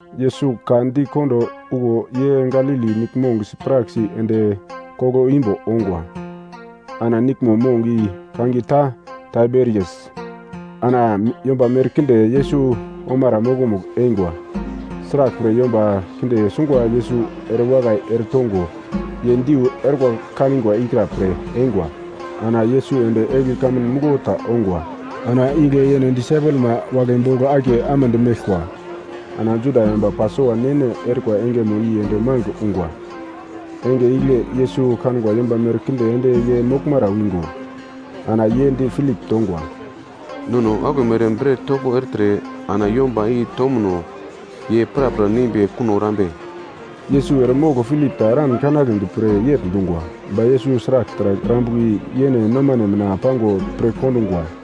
Yesus ka di kondo okuwo ye Galili Niglmong sipraksi ende koglo imbo ongwa, ana niglmo mong i kangiye ta Taiberias. Ana yomba merkinde Yesus omara mokomugl eingwa, sraglpre yomba kinde sungwa Yesus erewakai ere tongo, ye diu orkwa kanigwa ikra pre eingwa. Ana Yesus ende egli kamun muglo ta ongwa. Ana igle yene disaipelma wagle bogl akiye amedi meglkwa. Ana Juda yomba Pasova ne-ne erikwa engeno i ende magl ungwa. Enge igle Yesus kangwa yomba merkinde ende ye moglmara wingo, ana ye di Pilip tongwa, “Nono aglomere bret topo ertre ana yomba i tomuno ye prapra neimbi kuno erambe?” Yesus eremogl Pilip ta eran kanagledi pre yegl dungwa, ba Yesus sragl taragl erambuka i yene nomane mina pango pirkondungwa.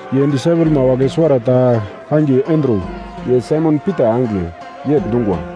Ye disaipelma wagle suwarata kangiye Andru, ye Saimon Pita angigle, yegl dungwa,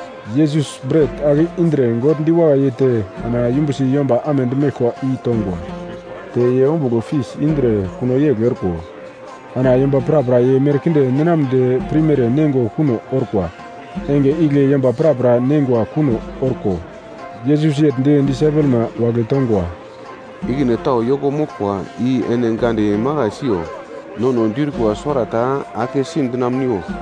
Yesus bret ake indre God diwakai yeite, ana yumbusi yomba amedi meglkwa i tongwa. Te ye ombugl fis indre kuno yegl orko, ana yomba prapra ye merkinde ninamnedi pirmere neingo kuno orkwa. Enge igle yomba prapra neingwa kuno orko, Yesus yegl di disaipelma wagle tongwa, “Ikine tau yoko moglkwa i ene gande makai siyo, nono diurkwa suwarata akesi dinamuniwo.”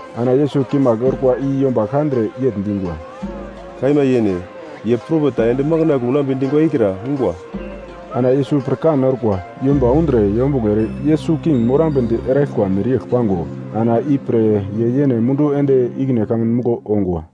Ana Yesus kimagl orkwa i yomba kandre yegl dingwa, “Kaima yene, ye propet ta ende makandle unambe dingwa ikra ungwa.” Ana Yesus pirkan orkwa, yomba undre yombuglo ere Yesus king morambedi eraglkwa mereyegl pango ana i pre ye yene mundu ende ikine kamun muglo ongwa.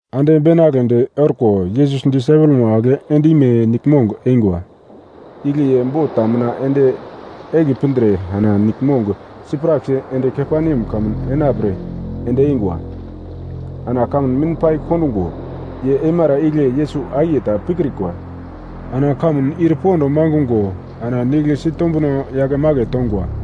Ande beinagledi orko, Yesus disaipelma wagle ende ime niglmong eingwa. Igle ye bot ta mina ende egli pindre ana niglmong sipraksi ende Kaperneam kamun enapre ende eingwa. Ana kamun mim pai kondungo, ye eimara igle Yesus akiye ta pikrikwa. Ana kamun ir pond mangungo ana nigl sitombuno yakemake tongwa.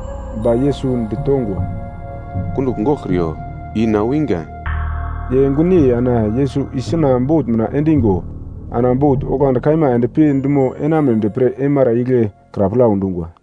Ba Yesus ditongwa, “Kundugl goglkriyo, i na wingwa.” Ye gunyei ana Yesus isuna bot mina endongo ana bot onglandi kaima endpi dumo enamunedi pre eimara igle kra plau dungwa.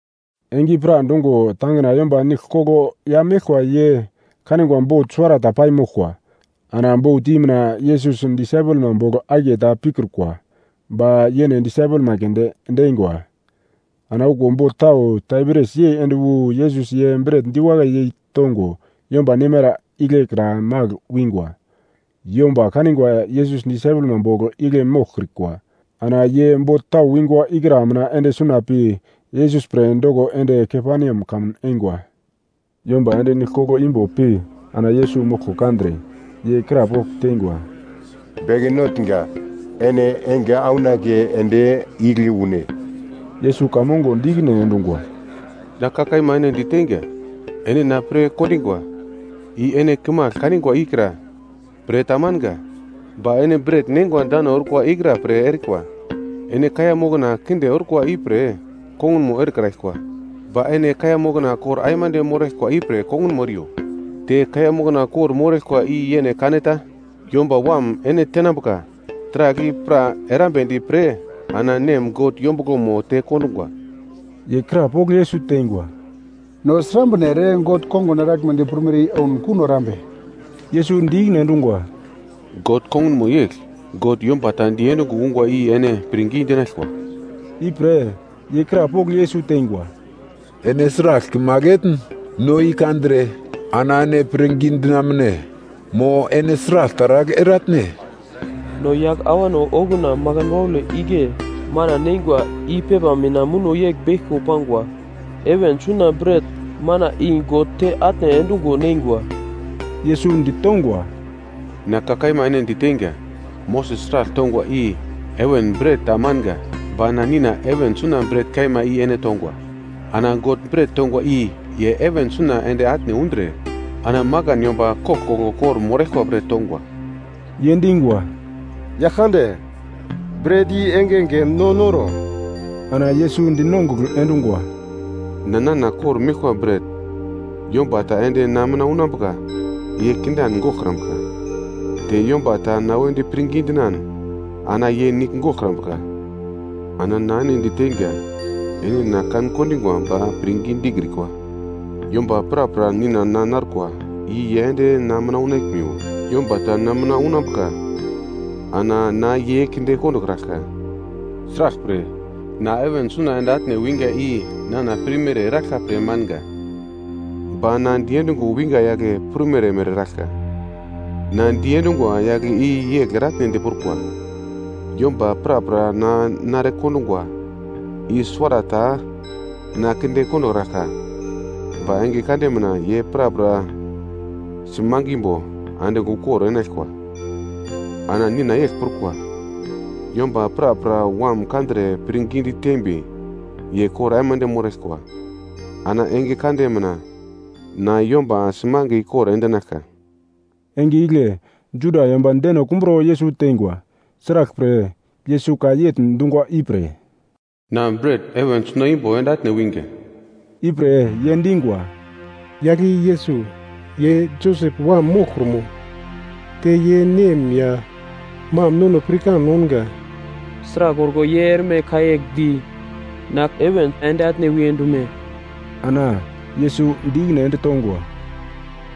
Enge i pradungo tangina yomba nigl koglo ya meglkwa ye kanigwa bot suwarata pai moglkwa, ana bot i mina Yesus disaipelma bogl akiye ta pikrukwa. Ba yene disaipelma keunde ende eingwa. Ana okuwo bot tau, Tiberias yei ende wu Yesus ye bret diwakai yei tongo yomba neimara igle kra magl wingwa. Yomba kanigwa Yesus disaipelma bogl igle moglkrikwa, ana ye bot tau wingwa ikra mina ende suna pi, Yesus pre doko ende Kaperneam kamun eingwa. Yomba ende nigl koglo imbo pi ana Yesus moglko kandre, ye krapogl teingwa, “Beke Notnga, ene enge aunake ende igle une?” Yesus ka mongo di ikine endungwa, “Na ka kaima ene di teinga, ene na pre dokingwa, i ene kimagl kanigwa ikra pre ta manga, ba ene bret neingwa dano orkwa ikra pre erikwa. Ene kaiya mokna kinde orkwa ipre kongunmo erekraglkwa ba ene kaiya mokna kor aimande moraglkwa ipre kongunmo eriyo. Te kaiya mokna kor-moraglkwa i yene kaneta, Yomba Wam ene tenambuka, taragl i pra erambedi pre ana Nem God yombuglomo te kondungwa.” Ye krapogl Yesus teingwa, “No srambre ere God kongun eraglmedi prumere i ouno kuno erambe?” Yesus di ikine endungwa, “God kongunmo yegl: God yomba ta diendungo ungwa i ene pirngi dinaglkwa.” Ipre ye krapogl Yesus teingwa, “Ene sragl kimagl etn no i kandre ana ene pirngi dinamune? Mo ene sragl taragl eratne? No yagl awano okuna makan waule igle mana neingwa i pepa mina muno yegl beglko pangwa: ‘Heven suna bret-mana i God te atne endungo neingwa.’” Yesus ditongwa, “Na ka kaima ene diteinga, Moses taragl tongwa i heven bret ta manga, ba na Nina heven suna bret kaima i ene tongwa. Ana God bret tongwa i ye heven suna ende atne undre, ana makan yomba koglkoglo kor-moraglkwa pre tongwa.” Ye dingwa, “Yagl kande, bret i engenge no noro.” Ana Yesus dinongugl endungwa, “Na nana kor-meglkwa bret, yomba ta ende na mina unambuka ye kindan goglkrambuka, te yomba ta na wedi pirngi dinan, ana ye nigl goglkrambuka. Ana na ene diteinga, ene na kan-kondingwa ba pirngi dikrikwa. Yomba prapra Nina na narkwa i ye ende na mina unaglmiwo, yomba ta na mina unambuka ana na ye kinde kondokraglka. Sraglpre na heven suna ende atne winga i nana pirmere eraglka pre manga, ba na diendungo winga yagle prumere mere eraglka. Na diendungwa yagle i yegl eretenedi prukwa, yomba prapra na nare kondungwa i suwarata na kinde kondokraglka ba enge kande mina ye prapra simangimbo andigl ukor enaglkwa. Ana Nina yegl prukwa, yomba prapra Wam kandre pirngi ditembi ye kor aimande moraglkwa. Ana enge kande mina na yomba simange ikor endinaglka.” Enge igle Juda yomba deno kumbro Yesus teingwa, sraglpre Yesus ka yegl dungwa ipre, “Na bret heven suna imbo ende atne winga.” Ipre ye dingwa, “Yagl i Yesus, ye Josep wam moglkrumo? Te ye nem ya mam nono pirkan ounga. Sragl orko ye erme ka yegl di, na heven ende atne wiye dume?” Ana Yesus di ikine ende tongwa,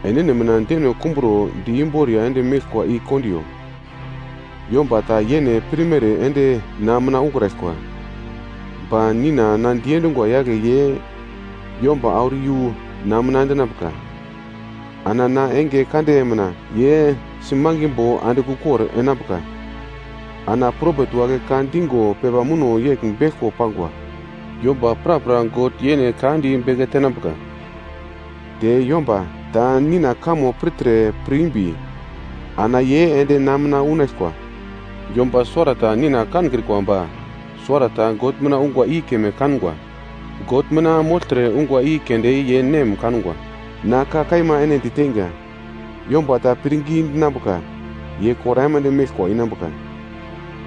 “Enene mina deno kumbro di imboriya ende meglkwa i kondiyo. Yomba ta yene pirmere ende na mina ukraglkwa, ba Nina na diendungwa yagle ye yomba auro iyu na mina endinambuka. Ana na enge kande mina ye simangimbo andigl ukor enambuka. Ana propet wagle ka dingo pepa muno yegl beglko pangwa, ‘Yomba prapra God yene ka di beke tenambuka.’ Te yomba ta Nina kamo pirtre pir imbi, ana ye ende na mina unaglkwa. Yomba suwarata Nina kankrikwa ba suwarata God mina ungwa i keme kangwa, God mina mogltre ungwa i keunde ye Nem kangwa. Na ka kaima ene diteinga, yomba ta pirngi dinambuka ye kor aimande meglkwa inambuka.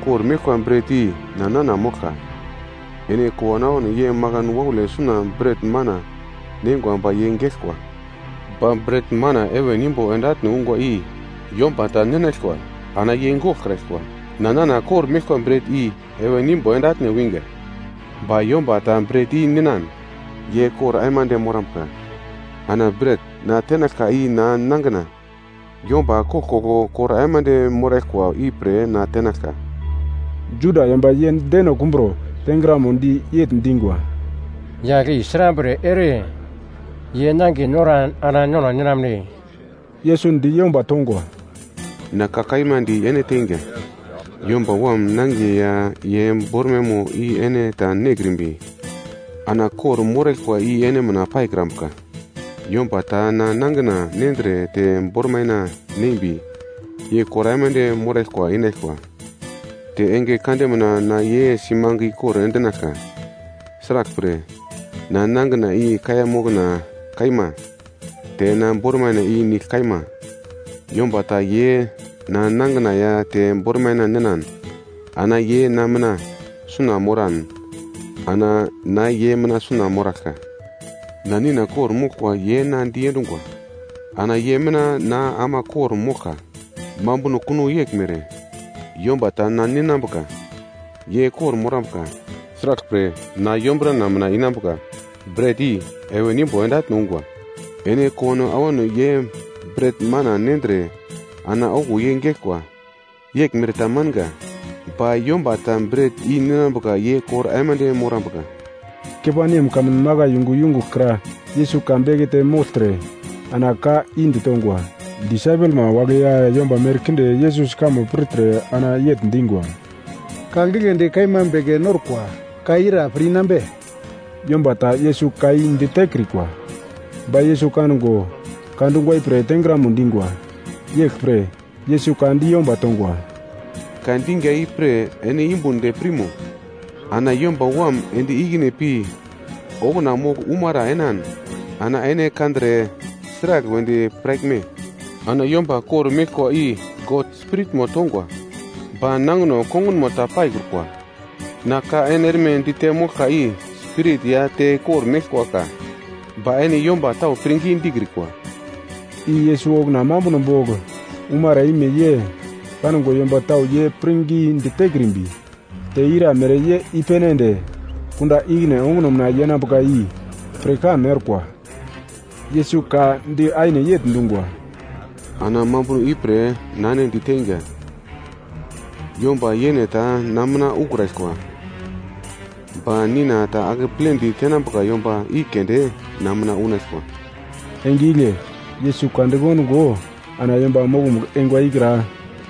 Kor meglkwa bret i na nana moglka. Ene kowano ye makan waule suna bret-mana neingwa ba ye geglkwa. Ba bret-mana heven imbo ende atne ungwa i yomba ta ninaglkwa, ana ye goglkraglkwa. Na nana kor-meglkwa bret i heven imbo ende atne wingwa ba yomba ta bret i ninan, ye kor aimande morambuka. Ana bret na tenaglka i na nangina, yomba koglkoglo kor aimande moraglkwa ipre na tenaglka.” Juda yomba ye deno kumbro tengramodi yegl dingwa, “Yagl i srambre ere ye nangiye noran ana nono ninamne?” Yesus di yomba tongwa, “Na ka kaima di ene teinga, Yomba Wam nangiye ya ye bormaimo i ene ta nekrimbi ana kor-moraglkwa i ene mina paikrambuka. Yomba ta na nangina nendre te bormaina neimbi ye kor aimande moraglkwa inaglkwa, te enge kande mina na ye simange ikor endinaglka. Sraglpre na nangina i kaiya mokna kaima, te na bormaina i nigl kaima. Yomba ta ye na nangina ya te bormaina ninan ana ye na mina suna moran, ana na ye mina suna moraglka. Ana Nina kor-moglkwa ye na diendungwa, ana ye mina na ama kor-moglka, mambuno kuno yeglmere, yomba ta na ninambuka ye kor-morambuka, sraglpre na yombrana mina inambuka. Bret i heven imbo ende atne ungwa. Ene kowano awano ye bret-mana nendre ana okuwo ye geglkwa. Yeglmere ta manga, ba yomba ta bret i ninambuka ye kor aimande morambuka.” Kaperneam kamun makai yungu yungugl kra Yesus ka bekete mogltre ana ka i ditongwa. Disaipelma wagle ya yomba merkinde Yesus kamo pirtre ana yegl dingwa, “Ka giglendi kaima beke norkwa, ka i ira pir-inambe?” Yomba ta Yesus ka i ditekrikwa, ba Yesus kango ka dungwa ipre tengramo dingwa. Yeglpre Yesus ka di yomba tongwa, “Ka dinga ipre ene yumbun de pirmo? Ana Yomba Wam ende ikine pi okuna mogl umara enan ana ene kandre sragl wedi piraglme? Ana yomba kor-meglkwa i God Spiritmo tongwa, ba nangino kongunmo ta paikrukwa, na ka ene erme dite moglka i spirit ya te kor-meglkwa ka. Ba ene yomba tau pirngi dikrikwa.” I Yesus okuna mambuno bogl umara ime ye kangwa yomba tau ye pirngidi tekrimbi, te iramere ye i-pene ende kunda ikine onguno mina yenambuka i pirkan orkwa. Yesus ka di aine yegl dungwa, “Ana mambuno ipre na ene diteinga, yomba yene ta na mina ukraglkwa, ba Nina ta akepledi tenambuka yomba i keunde na mina unaglkwa.” Enge igle Yesus ka dikondungo ana yomba mokomugl eingwa ikra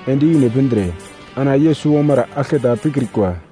ende ikine pindre ana Yesus omara aglketa pikrikwa.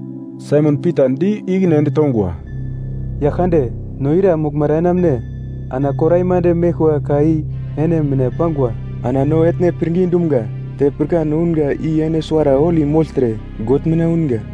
Saimon Pita di ikine ende tongwa, “Yaglkande, no ira moglmara enamune? Ana kor aimande meglkwa ka i ene mina pangwa. Ana no etne pirngi dumga, te pirkan ounga i ene Suwara Holi mogltre, God mina unga.”